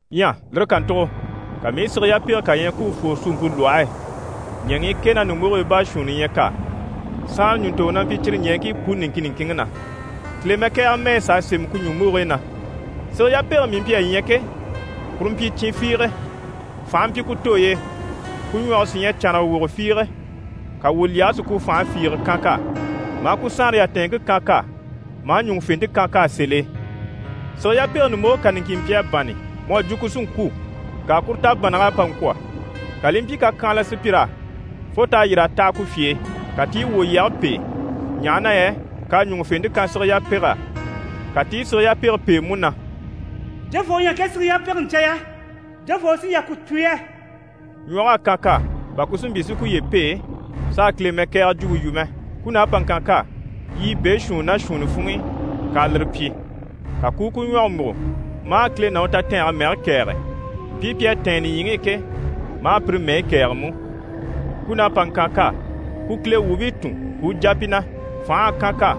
Ɲyɛ lire kàntugo, ka mii i sige yapege kà ɲya ku u fwore suumpe lwɔhe e. Ɲɛŋii kɛ ná ɲùmbogigii baashuunni ɲyɛ k'á. Saanre ɲùntoŋɔ na mpyi cyire ɲɛɛŋkii puni niŋkin niŋkinŋi na, Kile mɛkɛgɛrɛ mɛyi s'à sémɛ ku ɲùmbogigii na. Sige yapege mii mpyi a ɲya ke, kuru mpyi cin fiige. Fànhe mpyi ku tooy'e, ku ɲwɔge sí ɲyɛ cànraga wogo fiige. Ka wwòlyɛge si ku fànhe fiige kan k'á, maa ku saanre yatɛɛnŋke kan k'á, maa ɲùŋufente kan k'á sèl'e. Sige yapege ɲùmboge kà niŋkin mpyi a bânni mu à jwo ku sí n‑kwû. Ŋka kuru tabannag'à pa ŋkwɔ̀, ka li i mpyi kakyanhala sùpyir'á fo t'à yîr'a taha ku fye e. Ka ti i wwòlyɛge pêe, ɲaha na yɛ k'à ɲùŋufente kan sige yapeg'á. Ka ti i sige yapege pêe mú na: «Jofoo u ɲyɛ ŋke sige yapege ɲca yɛ? Jofoo u sí n‑jà ku tùn yɛ?» Ɲwɔg'à kan k'á, bà ku si mpyi si kuye pêe, s'a Kile mɛkɛgɛrɛ jwumpe yu mɛ. Kun'à pa ŋkan k'á yiɲyɛ beeshuunni ná shuunni funŋ'i, k'a lire pyi. Ka ku u ku ɲwɔge múgo maa Kile ná u tatɛɛnge mɛge kɛ̀ɛge, mpii pi à tɛ̀ɛn nìɲyiŋi i ke, maa pire mɛyi kɛ̀ɛge mú. Kun'à pa ŋkan k'á, ku Kile wuubii tùn, ku u jà pi na. Fành'à kan k'á,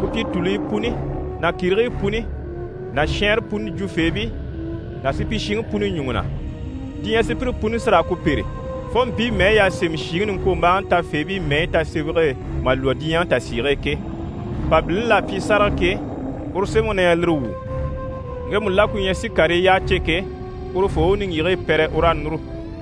ku pyi tùluyi puni ná kìrigii puni ná shɛɛnre puni jwufeebii ná supyishiŋi puni ɲùŋɔ na. Diɲyɛ sùpyire puni sí raa ku pêre, fo mpii mɛyi y'à sémɛ shìŋi niŋkwombaaŋi tafeebii mɛyi tasemɛge e mà lwɔ́ diɲyɛ tasiige e ke. Mpabilini l'à pyi sáraga ke, uru sémɛŋi na ɲyɛ lire wu. Ŋgemu la ku ɲyɛ si karii yyaha cè ke, urufoo u niŋgyigigii pɛrɛ, u raa núru.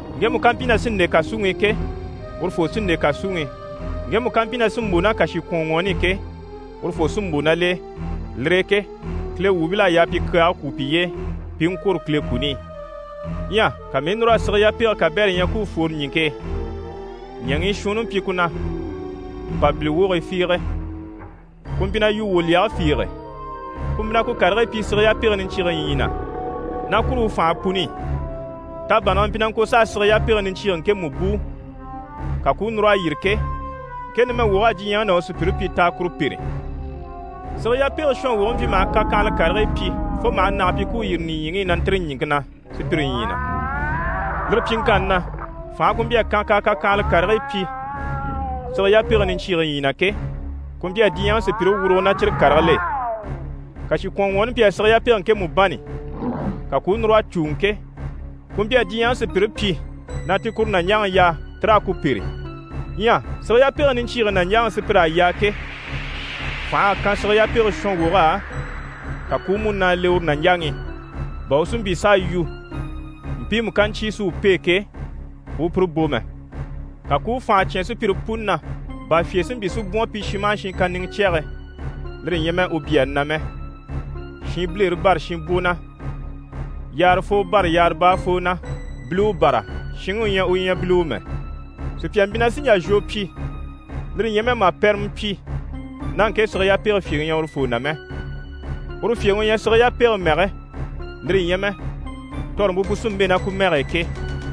Ŋgemu ká mpyi na sí n‑le kàsuŋi i ke, urufoo sí n‑le kàsuŋi i. Ŋgemu ká mpyi na sí n‑bò ná kàshikwɔnŋwɔɔni i ke, urufoo sí n‑bò ná l'e. Lire e ke Kile wuubil'à yaa pi kyaage kwú piye e, pi i ŋkwôro Kile kuni i. Ɲyɛ ka mii i núr'a sige yapege kabɛrɛ ɲya ku u fwore ɲìŋke e. Ɲɛŋii shuunni mpyi ku na mpàbili wogii fiige, ku mpyi na yu wwòlyɛgɛ fiige. Ku mpyi na ku karigii pyi sige yapege niɲcyiige ɲyii na, ná kuru u fànhe puni i. Tabannage mpyi na ŋko s'a sige yapege niɲcyiige ŋkemu bùu, ka ku u núr'a yîri ke, ŋke numɛ wog'à diɲyɛŋi ná u sùpyire pyi na t'a kuru pêre. Sige yapege shɔnwoge mpyi maha kakyanhala karigii pyi, fo maha nage pyi ku u yîri nìɲyiŋi i na ntîri ɲìŋke na sùpyire ɲyii na. Lire pyiŋkanni na, fànhe ku mpyi a kan k'à kakyanhala karigii pyi sige yapege niɲcyiige ɲyii na ke, ku mpyi a diɲyɛŋi sùpyire wurugo ná cyire karigil'e. Kàshikwɔnŋwɔɔni mpyi a sige yapege ŋkemu bânni, ka ku u núr'a cùuŋɔ ke, ku mpyi a diɲyɛŋi sùpyire pyi na ti kuru nàɲjaŋi yaa ti raa ku pêre. Ɲyɛ sige yapege niɲcyiige nàɲjaŋi sùpyir'à yaa ke, fành'à kan sige yapege shɔnwog'á, ka ku u múnaa le uru nàɲjaŋi i, bà u si mpyi s'a yu, mpiimu ká ɲcyé si u pêe ke, u u pire bò mɛ. Ka ku u fànha cyán sùpyire puni na, bà fyè si mpyi si bwɔ̀n pi shin maha shin kàniŋɛ cyɛge, lire ɲyɛ mɛ u byaani na mɛ, shinbilere bâra shinbwo na, yaarafoo bâra yaara baafoo na, biliwe bâra shinŋi u ɲyɛ u ɲyɛ biliwe mɛ. Sùpya mpyi na sì n‑jà zhwo pyi, lire ɲyɛ mɛ mà pɛrɛmɛ pyi, ná ŋke sige yapege fyèŋi ɲyɛ urufoo na mɛ. Uru fyèŋi u ɲyɛ sige yapege mɛge, lire ɲyɛ mɛ tɔrɔmpe pu sí n‑bɛ̂ ná ku mɛge e ke.